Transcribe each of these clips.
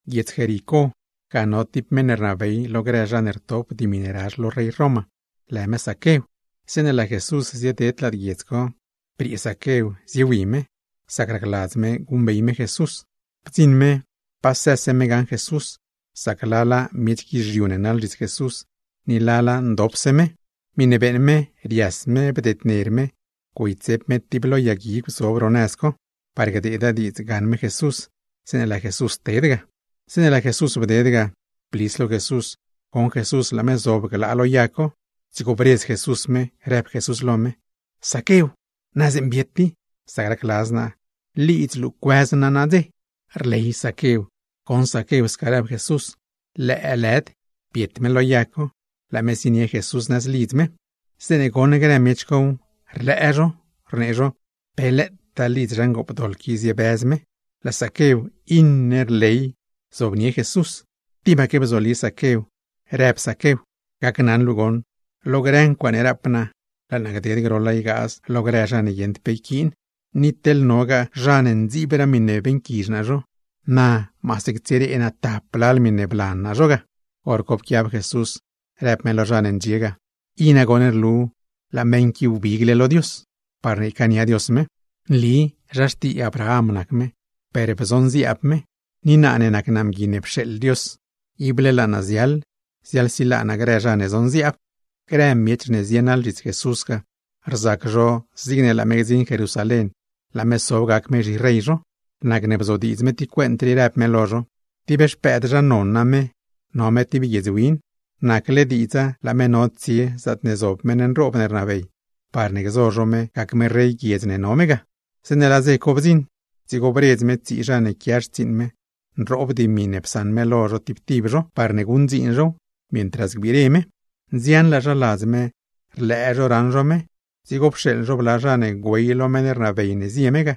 Guiedz Jericó, ga no tib meṉ ne rnabey lo grë zha ne rtop dimi ne razh lo rey Roma, lë me Zaquew. Zeeṉe laa Jesús zieded lad guiedz co, briee me, ziewi me, sac racladz me guṉbey me Jesús. Bdziṉ me, pasëse me gaṉ me Jesús, sac lala miech guizhiu ne naḻ zhits Jesús, ni lala ndopse me. Miṉe beeṉ me, rias me bdedner me güeytsep me tib lo yag guigw zob ro nëz co, par gdeeda diidza gaṉ me Jesús, zeeṉe laa Jesús ted ga. Zeeṉe laa Jesús bded ga, blis lo Jesús goṉ Jesús laa me zob ga, dzigo bredz Jesús me, rëb Jesús lo me: ―Zaquew, na zeeṉa biet i. Sac racladz naa, lidz luu cuëz naa nadze. Rley Zaquew goṉ Zaquew sca rëb Jesús, lëëlëd biet me lo yag co, laa me zienie Jesús nëz lidz me. Zeeṉe goṉ grë miech cow, rlëë zho, rnee zho: ―¡Pe lëëtaa lidz zha ngoopdoḻ qui ziebëz me! Laa Zaquew, iṉe rley zobnie Jesús. Tibaque bzoli Zaquew, rëb Zaquew: ―Gacnaṉ luu goṉ, lo grë ncuaaṉe rap naa, laa naa gded groḻa ygaaz lo grë zha ne guieṉd pe yquiin, ni teḻ nogaa zha ne ndziibraa miṉe beeṉquizh naa zho, naa maase ctsiree naa tap lal miṉe blan naa zho ga. Horco pquiab Jesús, rëb me lo zha ne ndxie ga: ―I nagoṉ rlu laa meṉ qui wbigle lo Dios, parne ycaania Dios me. Nli zha xtii Abraham nac me, per bzonziaab me ni naa ne nac naa Mgui ne pxeeḻ Dios, ible laa naa ziaḻ ziaḻsilaa naa grë zha ne zonziaab. Grë miech ne zienaḻ zhits Jesús ga, rzac zho zigne laa me gdziṉ Jerusalén, laa me sob gac me zhirey zho; nacne bzodiidz me tib cuent rii, rëb me lo zho: ―Tib xpëëd zha non name, no me tib guiedz win, nacle diidza laa me no tsie zaatne zob meṉ nroob ne rnabey, parne gzo zho me gac me rey guiedz ne no me ga. Zeeṉe laa dze co bdziṉ, dzigo bredz me tsii zha ne quia xtsiiṉ me, nroob dimi ne psaṉ me lo zho tib tib zho, parne guṉdziin zhow, mientras gbire me. ’Nzianlaa zha ladz me, rlëë zho raṉ zho me, dzigo pxeeḻ zho bla zha ne güey lo meṉ ne rnabey ne zie me ga,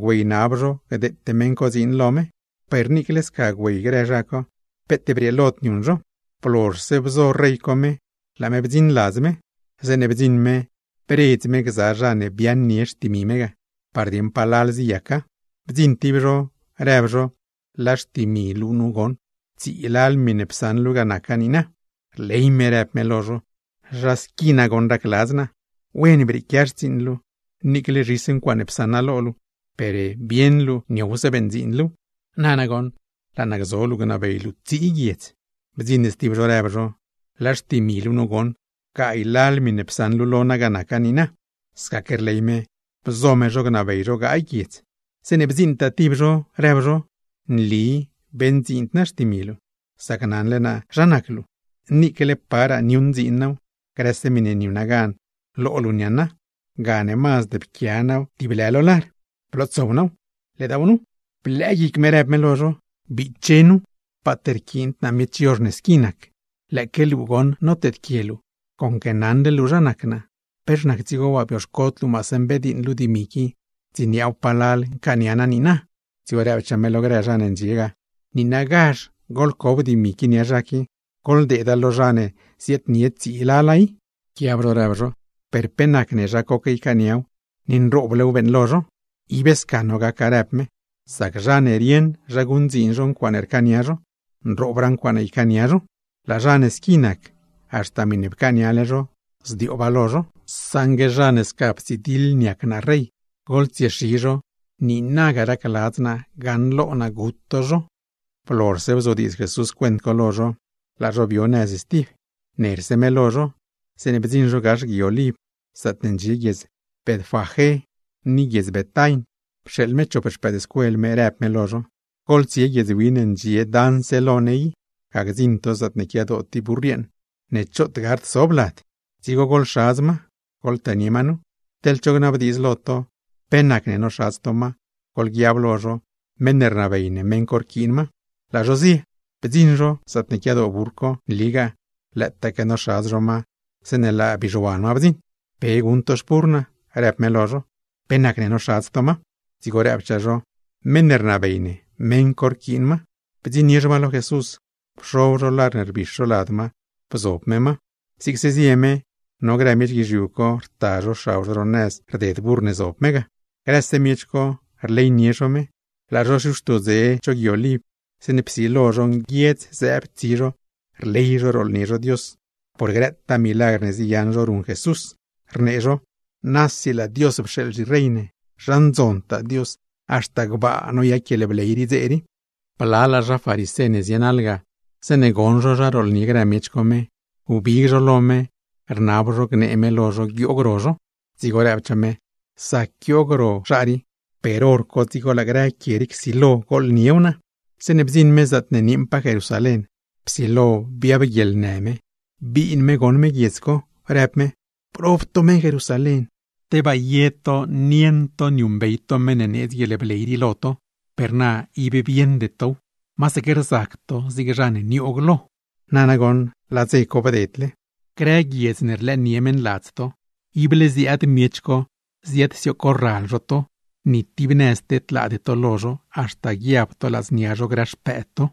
güeynab zho gdeete meṉ co dziin co lo me. Per niicle sca güey grë zha co, peet brieelod niuṉ zho. Blozhse bzo rey co me, laa me bdziṉ ladz me. Zeeṉe bdziṉ me, bredz me gza zha ne biaaṉnie xtimi me ga, par dieṉ palal ziyaca. Bdziṉ tib zho, rëb zho: “Laa xtimi luu nu goṉ, tsii lal miṉe psaṉ luu ga naca niina.” Rley me rëb me lo zho: “¡Zha squi nagoṉ racladz naa! ¡Wen brieequia xtsiiṉ luu! Niicle zhis ncuaaṉe psaṉ naa lo luu, per bieṉ luu niowse beṉdziin luuw. Na nagoṉ, laa naa gzo luu, gnabey luu tsii guiedz.” Bdziṉ stib zho, rëb zho: “Laa xtimi luu nu goṉ, gaay lal miṉe psaṉ luu lo naa ga naca niina.” Scaque rley me. Bzo me zho gnabey zho gaay guiedz. Zeeṉe bdziiṉtaa tib zho, rëb zho: “Nli beṉdziind naa xtimi luu, sac naṉle naa zha nac luu, niicle paraa niuṉdziin naaw, grëse miṉe niuṉa gan lo luu niaaṉa; gane mazd pquia naaw tib lë lo lar, blootsow naaw, ledaaw nu.” Blëë guic me, rëb me lo zho: “¡Biche nu, paat rquiind naa miech yozh ne squi nac! Conque naṉle luu zha nac naa, ¿pex nac dzigo waa bioxcod luu maase mbediiṉ luu dimi qui, ndziniaaw palal ncaania naaw niina?” Dzigo rëbchaa me lo grë zha ne ndxie ga: “Niinagazh goḻcob dimi qui nia zha qui, goḻdeeda lo zha ne ziaadnie tsii lala i.” Pquiab zho rëb zho: “Per pe nacne zha coque ycaaniaw, ni nrooblew beeṉlo zho.” “Ib sca no gaca”, rëb me, “sac zha ne rieṉ zha guṉdziin zho ncuaaṉe rcaania zho, nroobraa ncuaaṉe ycaania zho. Laa zha ne squi nac, haxta miṉe pcaaniale zho, zdiooba lo zho. Saṉgue zha ne sca ptsidiḻ niac naa rey, goḻtsiexi zho, niinaga racladz naa gaṉlo naa gut to zho.” Blozhse bzodiidz Jesús cuent co lo zho, laa zho bio nëz stib, nerse me lo zho. Zeeṉe bdziṉ zho gax Gui Oliv, zaatne ndxie guiedz Betfagé ni guiedz Betain, pxeeḻ me chop xpëëdscuel me, rëb me lo zho: ―Goḻtsie guiedz win ne ndxie daṉse lo ne i. Ga gdziṉ to zaatne quiadoo tib burr yeeṉ ne choot gard sob lad, dzigo goḻxadz ma, goḻtënie ma nu. Teḻ cho gnabdiidz lo to pe nacne noxadz to ma, goḻguiab lo zho: meṉ ne rnabey ne, meṉ co rquiin ma. Laa zho zie. Bdziṉ zho, zaatne quiadoo burr co, nligaa, lëëtaque noxadz zho ma, zeeṉe laa bizhuan ma bdziṉ. ―¿Pe guṉ to xpurr naa? ―rëb me lo zho―. ¿Pe nacne noxadz to ma? Dzigo rëbchaa zho: ―Meṉ ne rnabey ne, meṉ co rquiin ma. Bdziṉnie zho ma lo Jesús, pxob zho lar ne rbix zho lad ma, bzob me ma. Zigse zie me, no grë miech guizhiu co rta zho xab zho ro nëz rded burr ne zob me ga. Grëse miech co, rleynie zho me. Laa zho xiuxto dze cho gui Oliv, zeeṉe psilo zho nguiedz zëëb tsi zho, rley zho rooḻnie zho Dios, por grëtaa milagr ne ziyaṉ zho ruṉ Jesús; rnee zho: ―¡Nasi laa Dios pxeeḻ zhirey ne! ¡Zha ndzontaa Dios! ¡Haxta gbaa noyac guieḻbley dze rii! Blalaa zha farisé ne zienaḻ ga, zeeṉe goṉ zho zha rooḻnie grë miech co me, wbig zho lo me, rnab zho gnee me lo zho guioog ro zho. Dzigo rëbchaa me: ―¡Zac guioog ro zho, per hor co dzigo laa grë quie rii csilo gooḻniew naa! Zeeṉe bdziṉ me zaatne nieeṉpaa Jerusalén, psilo biab guieḻnë me, biin me goṉ me guiedz co, rëb me: ―¡Prob to meṉ Jerusalén! ¡Tebaa ye to nieṉ niuṉbey to meṉ ne needz guieḻbley rii lo to! Per na ib bieṉde tow, masaque rzac to zig zha ne nioog lo. Na nagoṉ laa dze co bdedle. Grë zha ne rlëë lo to, ible ziaad zho ziadsioog corral zho to, ni tib nëz tedlaade to lo zho, haxta guiab to ladznia zho, grë xpëëd to.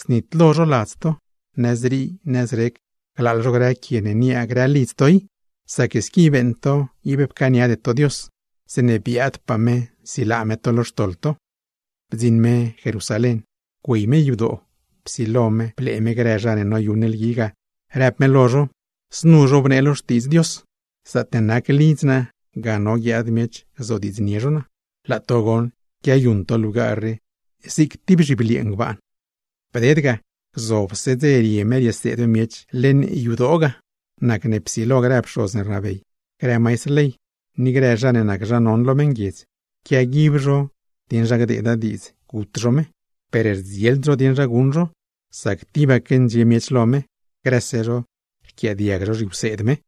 Znitlo zho ladz to, nëzrii nëzrec glaaḻ zho grë quie ne niaa grë lidz to i; sac squi beeṉ to ib pcaaniade to Dios, zeeṉe biaadpaa me nsilaa me to lo xtoḻ to. Bdziṉ me Jerusalén, güey me yadoo, psilo me blee me grëse zha ne noyuṉ lgui ga, rëb me lo zho: ―Znu zhobnee lo Xtiidz Dios: “Zaatne nac lidz naa, ga none guiaad miech gzodiidznie zho naa.” Laa to goṉ, quiayuṉ to lugar rii zig tib zhibliee ngbaan. Bded ga, gzobse dze rie me rieseed me miech leṉ yadoo ga. Nacne psilo grë pxoz ne rnabey, grë maistr ley, ni grë zha ne nac zha non lo meṉguiedz, quiaguib zho dieṉ zha gdeeda diidz gut zho me. Per rdzield zho dieṉ zha guṉ zho, sac tibaque ndxie miech lo me, grëse zho rquiaadiag zho zhiwseed me.